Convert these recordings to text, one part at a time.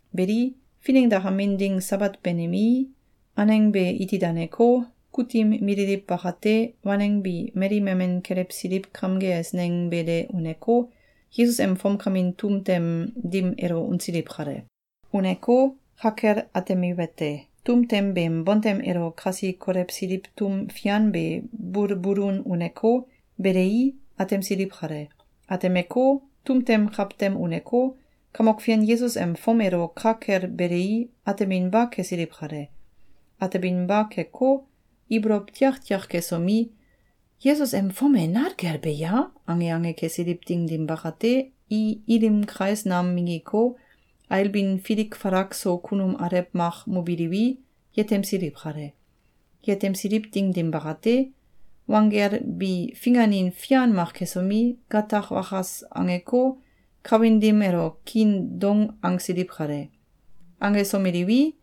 Beli, finengdakamin ding Sabat banimei, aneng be iti daneko, kutim mililiw bakate, waneng bi mali memen kelewsiliw kamge eisneng be de uneko, Yesus em fomkamin tum tem dim elo unsiliw kale. Uneko, ka kel atemiwete: Tum tem beem bontem elo kasi kolewsiliw tum fian be bulbulun uneko, belei, atemsiliw kale. Atemeko, tum tem kawtem uneko, Kamok Fian Yesus em fom elo ka kel belei, ateminba kesiliw kale. Ateminba keko, ibolow tiaktiak kesomi, “Yesus em fom e nal kel be ya?”, ange ange kesiliw ding dim bakate, i ilim kais nam minggiko, ailbin filik falak so kunum alew mak mobiliwi, yetemsiliw kale. Yetemsiliw ding dim bakate, wanggel bi finganin fian mak kesomi, gatak wakas angeko, kawin dim elo kiin doung angsiliw kale. Angesomeliwi,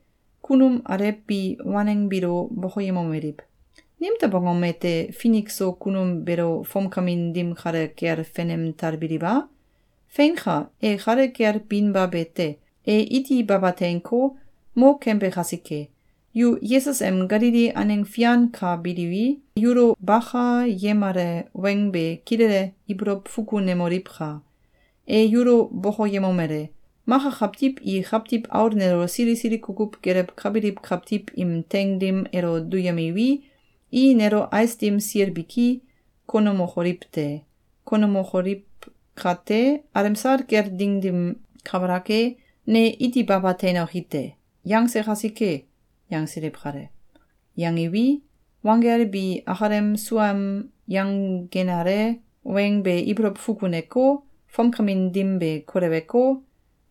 kunum alew bi waneng biilo bokoyemomeliw: “Nimtew angom ete, finik so kunum beelo fomkamin dim kale kel fenem talbiliw a? Feinka! E kale kel binba be te. E iti baba teinko, mo kembe kasike! Yu Yesus em Galili aneng fian ka biliwi, yulo bakayemale weng be kilele ibolow fukunemoliwka! E yulo bokoyemomele: ‘Maka kawtiw i Kawtiw Aul nelo sili sili kukuw gelewkabiliw kawtiw im teing dim elo duyemiwi, i nelo ais dim sil biki konemokoliw te. Konemokoliw kate, alemsal kel ding dim kabalak e, ne iti baba teinoki te.’, yangse kasike!”, yangsiliw kale. Yangiwi, wanggel bi akalem suaem yangenale weng be ibolow fukuneko, fomkamin dim be koleweko,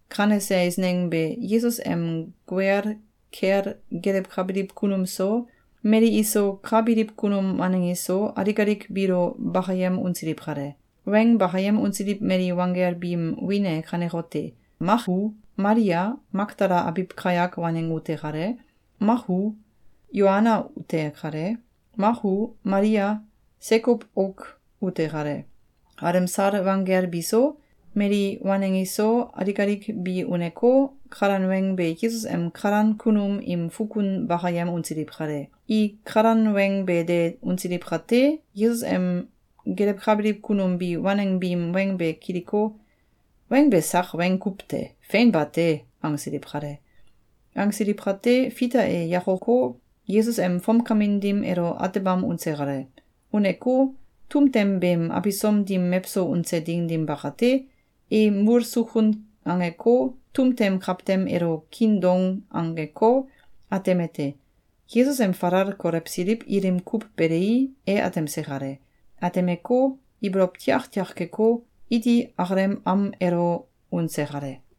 kanese eisneng be Yesus em guel kel gelewkabiliw kunum so, mali iso ka biliw kunum waneng iso, alik alik biilo bakayem unsiliw kale. Weng bakayem unsiliw mali wanggel biim wiin e kanekote: Mak u, Malia, Makdala abiw kayak waneng ute kale. Mak u, Yoana ute kale. Mak u, Malia, Sekow auk ute kale. Alemsal wanggel biso, mali waneng iso, alik alik bi uneko, kalan weng be Yesus em kalan kunum im fukun bakayem unsiliw kale. I kalan weng be de unsiliw kate, Yesus em gelewkabiliw kunum bi waneng biim weng be kiliko, “Weng be sak weng kuw te! Fein bate!”, angsiliw kale. Angsiliw kate, Fita e yakoko, Yesus em fomkamin dim elo atebam unse kale. Uneko, tum tem beem abisom dim mewso unse ding dim bakate, e mul sukun angeko, tum tem kawtem elo kiin doung angeko, atemete: Yesus em falal kolewsiliw ilim kuw belei, e atemse kale. Atemeko, ibolow tiaktiak keko, iti akalem am elo unse kale.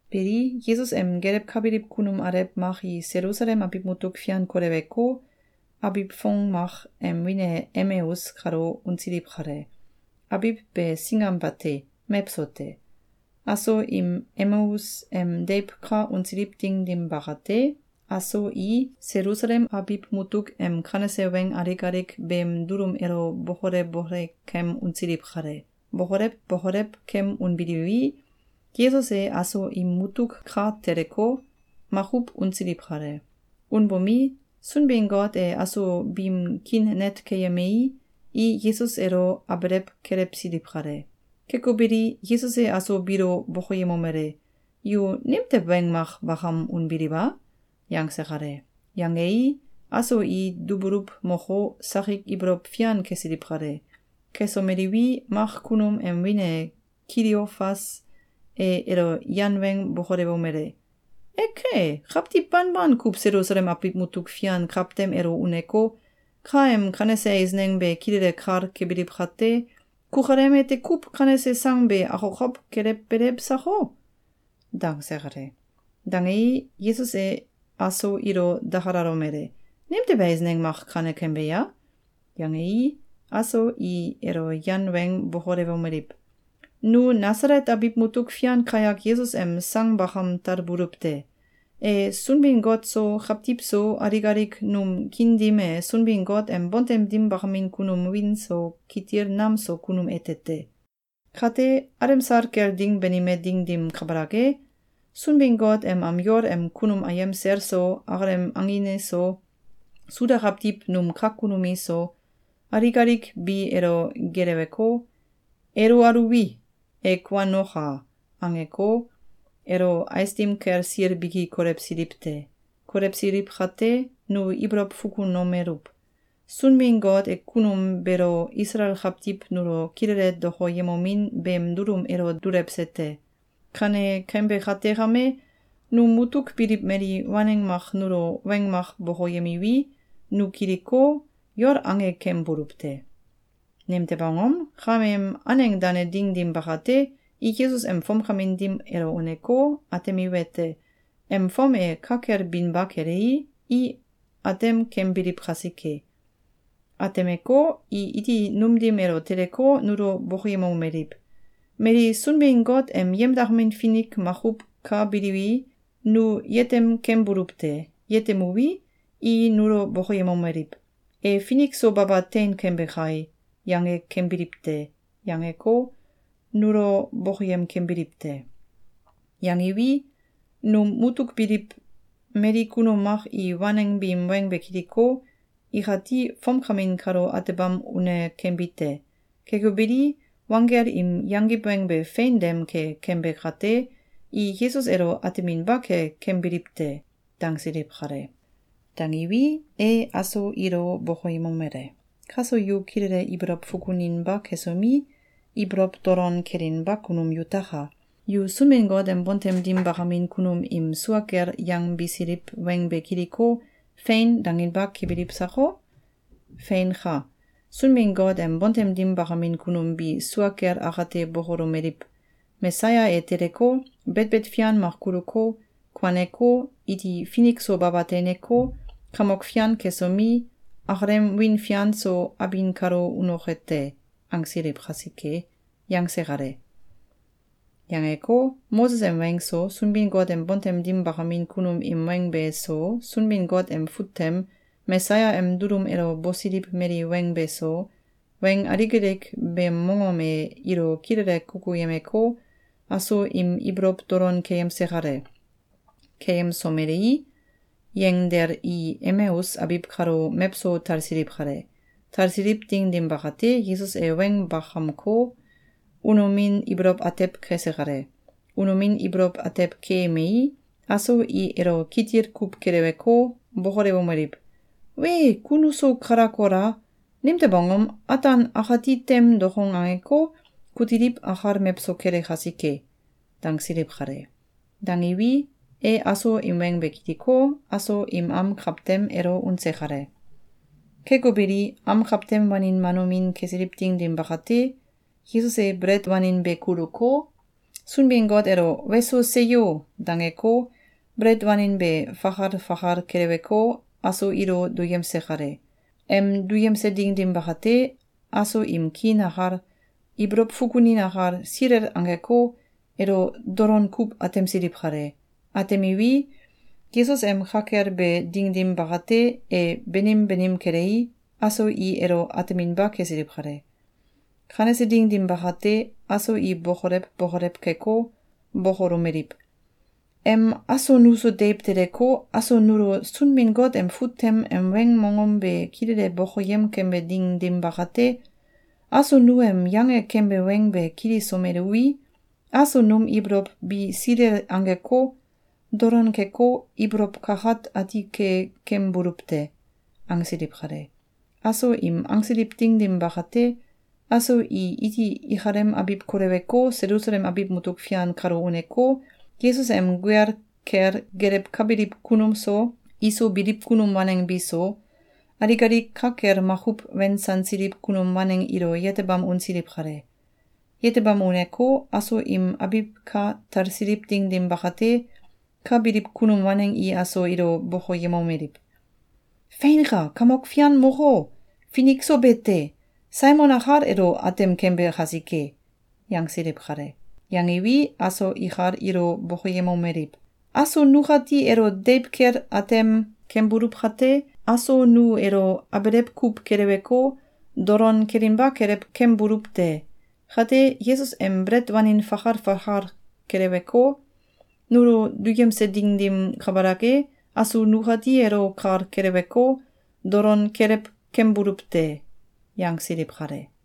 Beli, Yesus em gelewkabiliw kunum alew mak i Selusalem abiw mutuk fian koleweko, abiw fong mak em wiin e Emeus kalo unsiliw kale. Abiw be singam bate. Mewso te. Aso im Emeus em deiw ka unsiliw ding dim bakate, aso i Selusalem abiw mutuk em kanese weng alik alik beem dulum elo bokole bokole kem unsiliw kale. Bokolew bokolew kem unbiliwi, Yesus e aso im mutuk ka teleko, makuw unsiliw kale. Unbomi, Sunbin-Got e aso biim kiin net keyemei, i Yesus elo abelew kelewsiliw kale. Keko beli, Yesus e aso biilo bokoyemomele: “Yu nimtew weng mak bakam unbiliw a?”, yangse kale. Yangei, aso i dubuluw moko, sakik ibolow fian kesiliw kale. Kesomeliwi, mak kunum em wiin e Kiliofas e elo yan weng bokolewomele: “Eke! Kawtiw banban kuw Selusalem abiw mutuk fian kawtem elo uneko, ka em kanese eisneng be kilele kal kebiliw kate, kukalem ete kuw kanese sang be akokow kelewbelew sako?”, dangse kale. Dangei, Yesus e aso ilo dakalomele: “Nimtew eisneng mak kane kembe ya?”, yangei, aso i elo yan weng bokolewomeliw: “Nu Nasalet abiw mutuk fian kayak Yesus em sang bakam talbuluw te! E Sunbin-Got so, kawtiw so, alik alik num kiin dim e Sunbin-Got em bontem dim bakamin kunum wiin so kitil nam so kunum ete te. Kate, alemsal kel ding banime ding dim kabalak e, Sunbin-Got em am yol em kunum ayem sel so, akalem angin iso, Suda kawtiw num kak kunum iso, alik alik bi elo geeleweko, ‘Elo aluwi, e kuanoka!’, angeko, elo ais dim kel sil biki kolewsiliw te. Kolewsiliw kate, nu ibolow fukunomeluw: Sunbin-Got e kunum beelo Isalael kawtiw nulo kilele dokoyemomin beem dulum elo dulewse te. Kane kembe kate kame, num mutuk biliw mali waneng mak nulo weng mak bokoyemiwi, nu kiliko, yol ange kembuluw te. Nimtew angom? Kameem aneng dane ding dim bakate, i Yesus em fomkamin dim elo uneko, atemiwete: Em fom e ka kel binba kelei, i atem kembiliw kasike. Atemeko, i iti num dim elo teleko, nulo bokoyemomeliw: ‘Mali Sunbin-Got em yemdakamin finik makuw ka biliwi, nu yetem kembuluw te. Yetemuwi, i nulo bokoyemomeliw: ‘E finik so baba tein kembe kai!’, yange kembiliw te.’, yangeko, nulo bokoyem kembiliw te. Yangiwi, num mutuk biliw mali kunum mak i waneng biim weng be kiliko, ikati fomkamin kalo atebam une kembi te. Keko beli, wanggel im yangiw weng be fein dem ke kembe kate, i Yesus elo ateminba ke kembiliw te.”, dangsiliw kale. Dangiwi, e aso ilo bokoyemomele: “Kaso yu kilele ibolow fukuninba kesomi, ibolow dolon kelinba kunum yutaka! Yu Sunbin-Got em bontem dim bakamin kunum im sua kel yangbisiliw weng be kiliko, ‘Fein!’, danginba kebiliw sako? Feinka! Sunbin-Got em bontem dim bakamin kunum bi sua kel akate bokolomeliw: ‘Mesaya e teleko, betbet fian mak kuluko, kuaneko, iti finik so baba teineko, kamok fian kesomi, akalem wiin fian so abin kalo unoke te.’, angsiliw kasike!”, yangse kale. Yangeko, Moses em weng so, Sunbin-Got em bontem dim bakamin kunum im weng be so, Sunbin-Got em fut tem Mesaya em dulum elo bosiliw mali weng be so, weng alik alik beem mongom e ilo kilele kukuyemeko, aso im ibolow dolon keyemse kale. Keyemsomelei, yenggdel i Emeus abiw kalo mewso talsiliw kale. Talsiliw ding dim bakate, Yesus e weng bakamko, unomin ibolow atew kese kale. Unomin ibolow atew keemei, aso i elo kitil kuw keleweko, bokolewomeliw: “Wee! Ku nuso kalak kola! Nimtew angom? Ataan akati tem dokong angeko, kutiliw akal mewso kele kasike!”, dangsiliw kale. Dangiwi, e aso im weng be kiliko, aso im am kawtem elo unse kale. Keko beli, am kawtem wanin wanomin kesiliw ding dim bakate, Yesus e belet wanin be kuluko, Sunbin-Got elo “Weso! Seyo!”, dangeko, belet wanin be fakal fakal keleweko, aso ilo duyemse kale. Em duyemse ding dim bakate, aso im kiin akal, ibolow fukunin akal, silel angeko, elo dolon kuw atemsiliw kale. Atemiwi, Yesus em ka kel be ding dim bakate, e banim banim kelei, aso i elo ateminba kesiliw kale. Kanese ding dim bakate, aso i bokolew bokolew keko, bokolomeliw: “Em aso nuso deiw teleko, aso nulo Sunbin-Got em fut tem em weng mongom be kilele bokoyem kembe ding dim bakate, aso nu em yange kembe weng be kilisomeluwi, aso num ibolow bi silel angeko, dolon keko, ibolow kakat ati ke kembuluw te!”, angsiliw kale. Aso im angsiliw ding dim bakate, aso i iti ikalem abiw koleweko, Selusalem abiw mutuk fian kalo uneko, Yesus em guel kel gelewkabiliw kunum so, iso biliw kunum waneng bi so, alik alik ka kel makuw wensansiliw kunum waneng ilo yetebam unsiliw kale. Yetebam uneko, aso im abiw ka talsiliw ding dim bakate, ka biliw kunum waneng i aso ilo bokoyemomeliw: “Feinka! Kamok Fian moko, finik so be te! Saimon akal elo atem kembe kasike!”, yangsiliw kale. Yangiwi, aso ikal ilo bokoyemomeliw: “Aso nukati elo deiw kel atem kembuluw kate, aso nu elo abelew kuw keleweko, dolon kelinba kelew kembuluw te. Kate, Yesus em belet wanin fakal fakal keleweko, nulo duyemse ding dim kabalak e, aso nukati elo kal keleweko, dolon kelew kembuluw te.”, yangsiliw kale.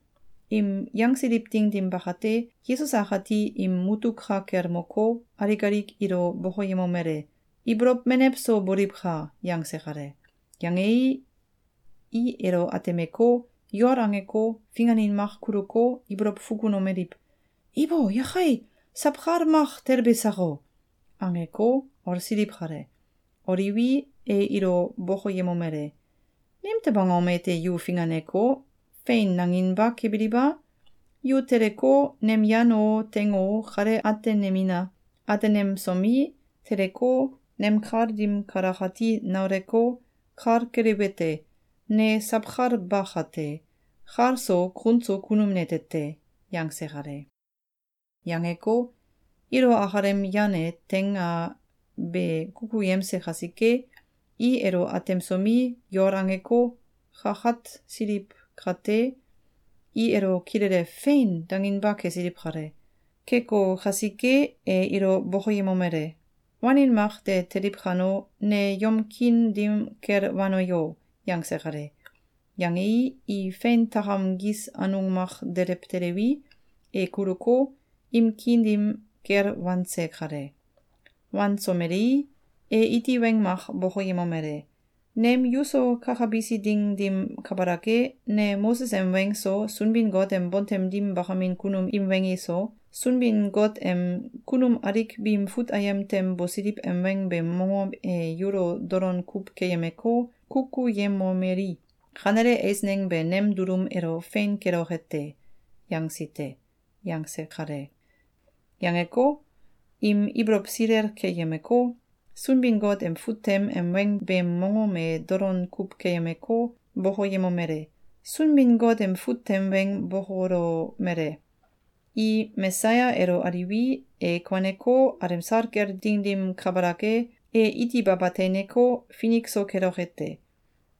Im yangsiliw ding dim bakate, Yesus akati im mutuk ka kel moko, alik alik ilo bokoyemomele: “Ibolow menew so boliwka!”, yangse kale. Yangei, i elo atemeko, yol angeko, finganin mak kuluko, ibolow fukunomeliw: “Ibo! Yakei! Sawkal mak telbe sako!”, angeko, olsiliw kale. Oliwi, e ilo bokoyemomele: “Nimtew angom ete yu finganeko, ‘Fein!’, nanginba kebiliw a? Yu teleko, nem yan o, teing o, kale atenemina! Atenemsomi, teleko, nem kal dim kalakati nauleko, kal keliwete: Ne sawkal ba kate, kal so kun so kunum nete te!”, yangse kale. Yangeko, ilo akalem yan a teing a be kukuyemse kasike, i elo atemsomi, yol angeko, kakatsiliw kate, i elo kilele “Fein!”, danginba kesiliw kale. Keko kasike, e ilo bokoyemomele: “Wanin mak de teliw kano, ne yom kiin dim kel wano yo!”, yangse kale. Yangei, i fein takam gis anung mak delew teliwi, e kuluko, im kiin dim kel wanse kale. Wansomelei, e iti weng mak bokoyemomele: “Nem yuso kakabisi ding dim kabalak e, ne Moses em weng so, Sunbin-Got em bontem dim bakamin kunum im weng iso, Sunbin-Got em kunum alik biim fut ayem tem bosiliw em weng beem mongom e yulo dolon kuw keyemeko, kukuyemomeli: ‘Kanele eisneng be nem dulum elo fein keloke te!’, yangsi te.”, yangse kale. Yangeko, im ibolow silel keyemeko, Sunbin-Got em fut tem em weng beem mongom e dolon kuw keyemeko, bokoyemomele: “Sunbin-Got em fut tem weng bokolomele: ‘I Mesaya elo aliwi, e kuaneko, alemsal kel ding dim kabalak e, e iti baba teineko, finik so keloke te.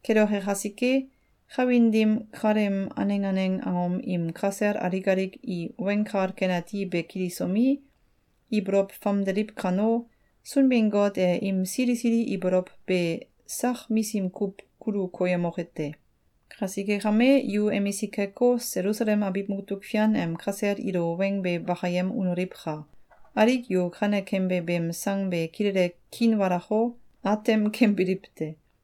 Keloke kasike, kawin dim kaleem aneng aneng angom im kasel alik alik i Weng Kal Ken Ati be kilisomi, ibolow famdeliw kano, Sunbin-Got e im sili sili ibolow be sak misim kuw kulu koyemoke te. Kasike kame, yu emisik keko, Selusalem abiw mutuk fian em kasel ilo weng be bakayem unoliwka! Alik yu kane kembe beem sang be kilele kiinwalako, atem kembiliw te.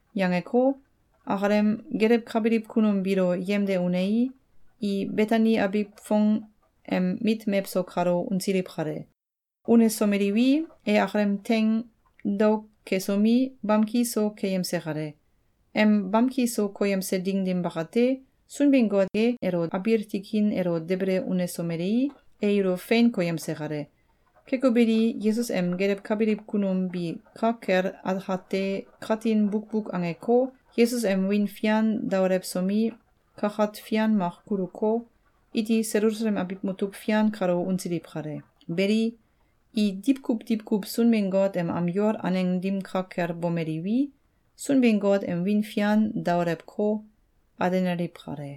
Yangeko, akalem gelewkabiliw kunum biilo yemde unei, i Betani abiw fong em mit mewso kalo unsiliw kale. Unesomeliwi, e akalem teing daok kesomi, bamki so keyemse kale. Em bamki so koyemse ding dim bakate, Sunbin-Got e elo abiil tikin elo debele unesomelei, e ilo fein koyemse kale. Keko beli, Yesus em gelewkabiliw kunum bi ka kel akate katin bukbuk angeko, Yesus em wiin fian daolewsomi, kakat fian mak kuluko, iti Selusalem abiw mutuk fian kalo unsiliw kale. Beli, i diwkuw diwkuw Sunbin-Got em am yol aneng dim ka kel bomeliwi, Sunbin-Got em wiin fian daolewko, alenaliw kale.